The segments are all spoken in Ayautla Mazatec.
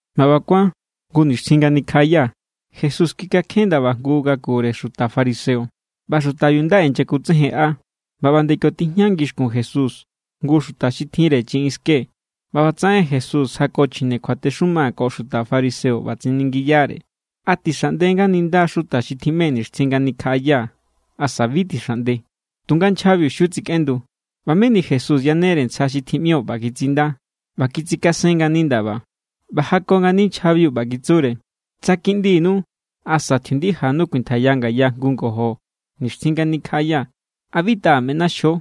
ꞌBa ꞌba kuán jngu nixtjin nga nikjaꞌaya, Jesús kikakjen ndaba jngu ngakure xuta fariseo, ꞌba xutabiu nda inyakutsejenꞌa. ꞌBa ꞌba nde kio tijña ngixkun Jesús jngu xuta xi tjinre chiꞌin ske. ꞌBa ꞌbatsaꞌen Jesús jako chjine kjuatexuma ko xuta fariseo, ꞌba tsiningiyare: —¿A tixaꞌnde nga ninda xuta xi tjiꞌme nixtjin nga nikjaꞌaya, asa bi tixaꞌnde? Tunga nchjabiu xiu tsikꞌendu. ꞌBa meni Jesús yanere ntsja xi tjiꞌmio ꞌba kitsinda ꞌba kitsikasen ngani ndaba. ꞌBa jako ngani nchjabiu, ꞌba kitsure: —Tsa kiꞌndinu asa tjiundijanu kuintjaiya ngaya jngu ngojo nixtjin nga nikjaꞌaya, ¿a bi taꞌa meꞌnaxjo?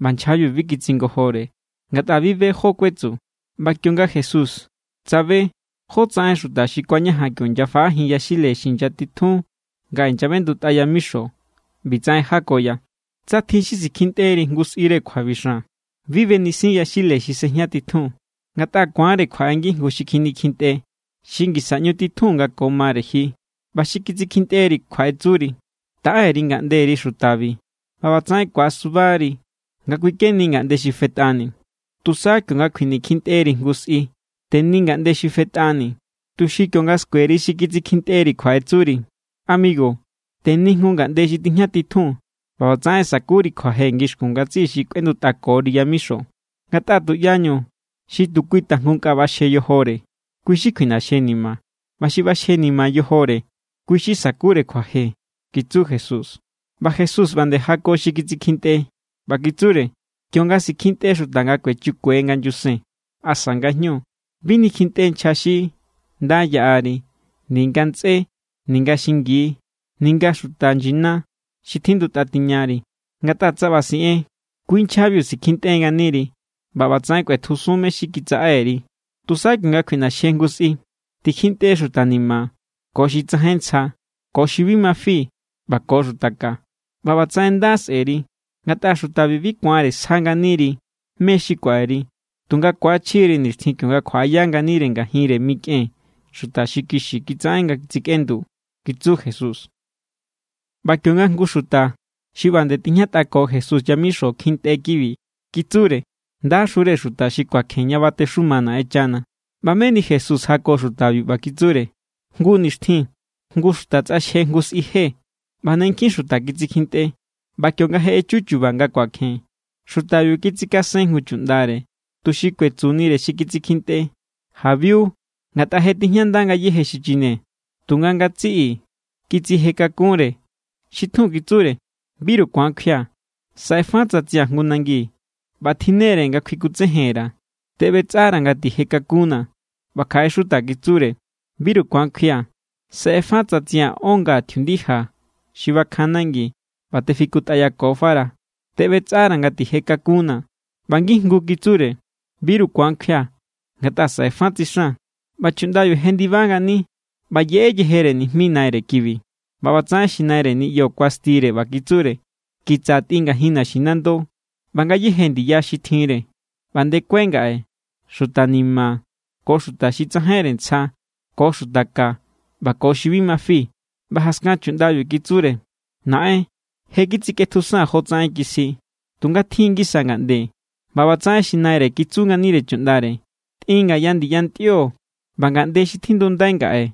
ꞌBa nchjabiu bi kitsingojore, ngatꞌa bi be jó= kuetsu. ꞌBa kionga Jesús tsabe jotsaꞌen xuta xi kuañajan kio inyafaꞌajin yaxile xi inyatitjun nga inyaꞌbendutꞌa yamixo, ꞌbitsaꞌen jakoya: —Tsa tjin xi sikjintꞌeri jngu sꞌire kjuabixan, bi benisin yaxile xi sejña titjun. Ngatꞌa ku̱anre kjuaꞌe ngijngu xi kjinikjintꞌe, xi ngisa ꞌñu titjun nga ko mare ji, ꞌba xi kitsikjintꞌeri kjuaꞌetsuri: “Taꞌe_ri ngaꞌnderi xutabi.” ꞌBa ꞌbatsaꞌen ku̱asuba=ri nga kꞌuikeni ngaꞌnde xi fetꞌani. Tusa kionga kjuinikjintꞌeri jngu sꞌi, teni ngaꞌnde xi fetꞌani, tuxi kionga skueri xi kitsikjintꞌeri, kjuaꞌetsuri: “Amigu, teni jngu ngaꞌnde xi tijñatitjun.” ꞌBa ꞌbatsaꞌen sakuri kjuaje ngixkun ngatsiꞌi xi kꞌuendutꞌakori yamixo. Ngatꞌa tuꞌyañu xi tu kui tajngu nkꞌa ꞌbaxje yojore, kui= xi kjuiꞌnaxjenima. ꞌBa xi ꞌbaxjenima yojore, kui= xi sakure kjuaje —kitsu Jesús. ꞌBa Jesús ꞌba nde jako xi kitsikjintꞌe, ꞌba kitsure: —Kionga sikintꞌe xuta nga kuechikue nga nyusen asa ngajñu, bi nikjintꞌe nchja xi nda yaꞌari ninga ntsꞌé ninga xingi ninga xuta nyina xi tjindutꞌa tiñari. Ngatꞌa tsa ꞌba siꞌen, kui nchjabiu sikjintꞌe nganiri ꞌba ꞌbatsaꞌen kꞌuetjusun mé= xi kitsaꞌe_ri. Tusa kionga kjuiꞌnaxje jngu sꞌi, tikjintꞌe xuta ni̱ma̱ ko xuta xi tsajain ntsja ko xuta xi bi ma fi ꞌba ko xuta ka, ꞌba ꞌbatsaꞌen nda sꞌe̱ri. Ngatꞌa xutabi bi ku̱anre sja nganiri mé= xi kuaꞌeri, tunga ku̱achjiri nixtjin kionga kjuaꞌaya nganire ngajinre mikꞌen xuta xi kixi kitsaꞌen nga tsikꞌendu —kitsu Jesús. ꞌBa kionga jngu xuta xi ꞌba nde tijñatꞌako Jesús yamixo kjintꞌe kibi, kitsure: —¡Ndaxure xuta xi kuakjen ña batexuma Naꞌenchana! ꞌBa meni Jesús jako xutabiu, ꞌba kitsure: —Jngu nixtjin jngu xuta tsꞌaxje jngu sꞌi je ꞌba ne nkjin xuta kitsikjintꞌe. ꞌBa kionga je echu chu̱ba̱ nga kuakjen, xutabiu kitsikasen jngu chuꞌndare tuxi kuetsunire xi kitsikjintꞌe: “Jabiu, ngatꞌa je tijñanda ngayéje xichine.” Tunga ngatsiꞌi kitsije kakunre. Xi tjun kitsure: “Biru ku̱an kjuia̱. Saꞌe fa tsatsia̱ jngu nangi ꞌba tjinnere nga kjuikutsejen_ra̱. Teꞌbetsꞌara̱ nga tije kakunnaa̱.” ꞌBa kjaꞌe xuta kitsure: “Biru ku̱an kjuia̱. Saꞌe fa tsatsia̱ ón nga tjiundija xi bakjan nangi ꞌba tefikutꞌayakofa_ra̱. Teꞌbetsꞌara̱ nga tije kakunnaa̱.” ꞌBa ngijngu kitsure: “Biru ku̱an kjuia̱ ngatꞌa saꞌe fa tsixan.” ꞌBa chuꞌndabiu jendiba ngani ꞌba yeꞌe yejere nijmi naire kibi. ꞌBa ꞌbatsaꞌen xi naire niꞌyo kuastire, ꞌba kitsure: “Kitsa tꞌin ngajin naxinando ꞌba ngayéje ndiya xi tjinre, ꞌba ndekue ngaꞌe xuta ni̱ma̱ ko xuta xi tsajainre ntsja ko xuta ka ꞌba ko xi bi ma fi.” ꞌBa jaskan chuꞌndabiu kitsure: “Naꞌen, je kitsikꞌetjusaa̱n jotsaꞌen kisji, tunga tjin= ngisa ngaꞌnde.” ꞌBa ꞌbatsaꞌen xi naire kitsu nganire chuꞌndare: “Tꞌin ngaya ndiyantꞌio ꞌba ngaꞌnde kiꞌndi xi tjindundai ngaꞌe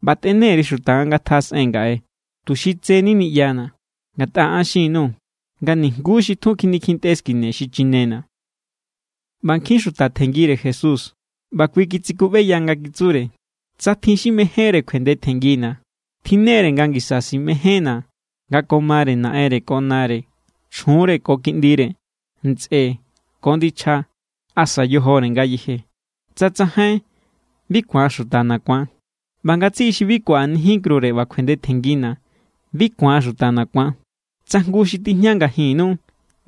ꞌba tꞌene_ri xuta nga ngatjaꞌasꞌen ngaꞌe, tuxi tseni niꞌyana̱. Ngatꞌa an xin_nuu̱ nga nijnguú xi tjun kjinikjintꞌe skine xichinena̱.” ꞌBa nkjin xuta tjenngire Jesús, ꞌba kui kitsikuꞌbeya nga kitsure: —Tsa tjin xi mejénre kjuendetjenngina̱ tjinnere nga ngisa simejénna̱ nga ko mare naꞌenre ko nare, chjunre ko kiꞌndire, ntsꞌe ko ndichja asa yojore ngayeje. Tsa tsajain, bi ku̱an xutana̱ ku̱an. ꞌBa ngatsiꞌi xi bi kuaꞌanijin krure ꞌba kuendetjenngina̱, bi ku̱an xutana̱ ku̱an. Tsa jngu xi tijña ngajinnu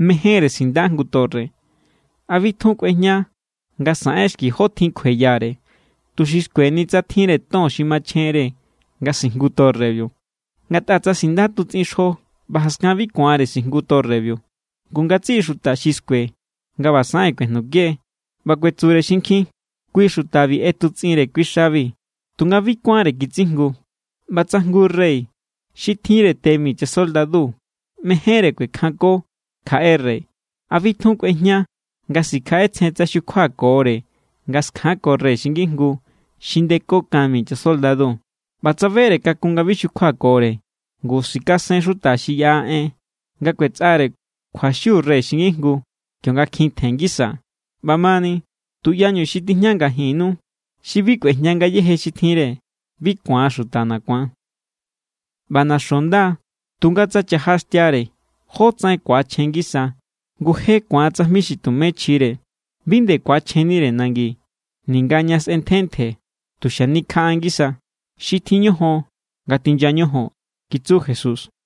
mejénre sinda jngu torre, ¿a bi tjun kꞌuejña nga saꞌen xki jó tjin kjueyare, tuxi skueni tsa tjinre ton xi machjenre nga sijngu torrebiu? Ngatꞌa tsa̱ sinda tutsꞌin xjo ꞌba jaskan bi ku̱anre sijngu torrebiu, ngu ngatsiꞌi xuta xi skue nga ꞌba saꞌen, kꞌuejnuke. ꞌBa kuetsure xinkjin: “Kui xutabiu ꞌetutsꞌinre kui xabi, tunga bi kuánre kitsijngu.” ꞌBa tsa jngu rey xi tjinre te mi chasoldadu mejénre kuekjanko kjaꞌe rey, ¿a bi tjun kꞌuejña nga sikjaꞌetsjen tsa xukjuakore nga skjanko rey xi ngijngu xi ndeko kan mi chasoldadu? ꞌBa tsa bere kakun nga bi xukjuakore, ngu sikasen xuta xi yaꞌa en nga kꞌuetsꞌare kjuaxiu rey xi ngijngu, kionga kjin tjen ngisa. ꞌBamani, tuꞌyañu xi tijña ngajinnu xi bi kꞌuejña ngayéje xi tjinre, bi ku̱an xutana̱ ku̱an. ’ꞌBa naxo nda, tunga tsa chaja xi xtiare, ¿jó tsaꞌen ku̱achjen ngisa? Ngu je ku̱an tsajmi xi tumé chjire. Bi nde ku̱achjennire nangi, ninga ña sꞌentje ntje. Tu xanikjaꞌa ngisa. Xi tjin ñojon, ngatinya ñojon —kitsu Jesús.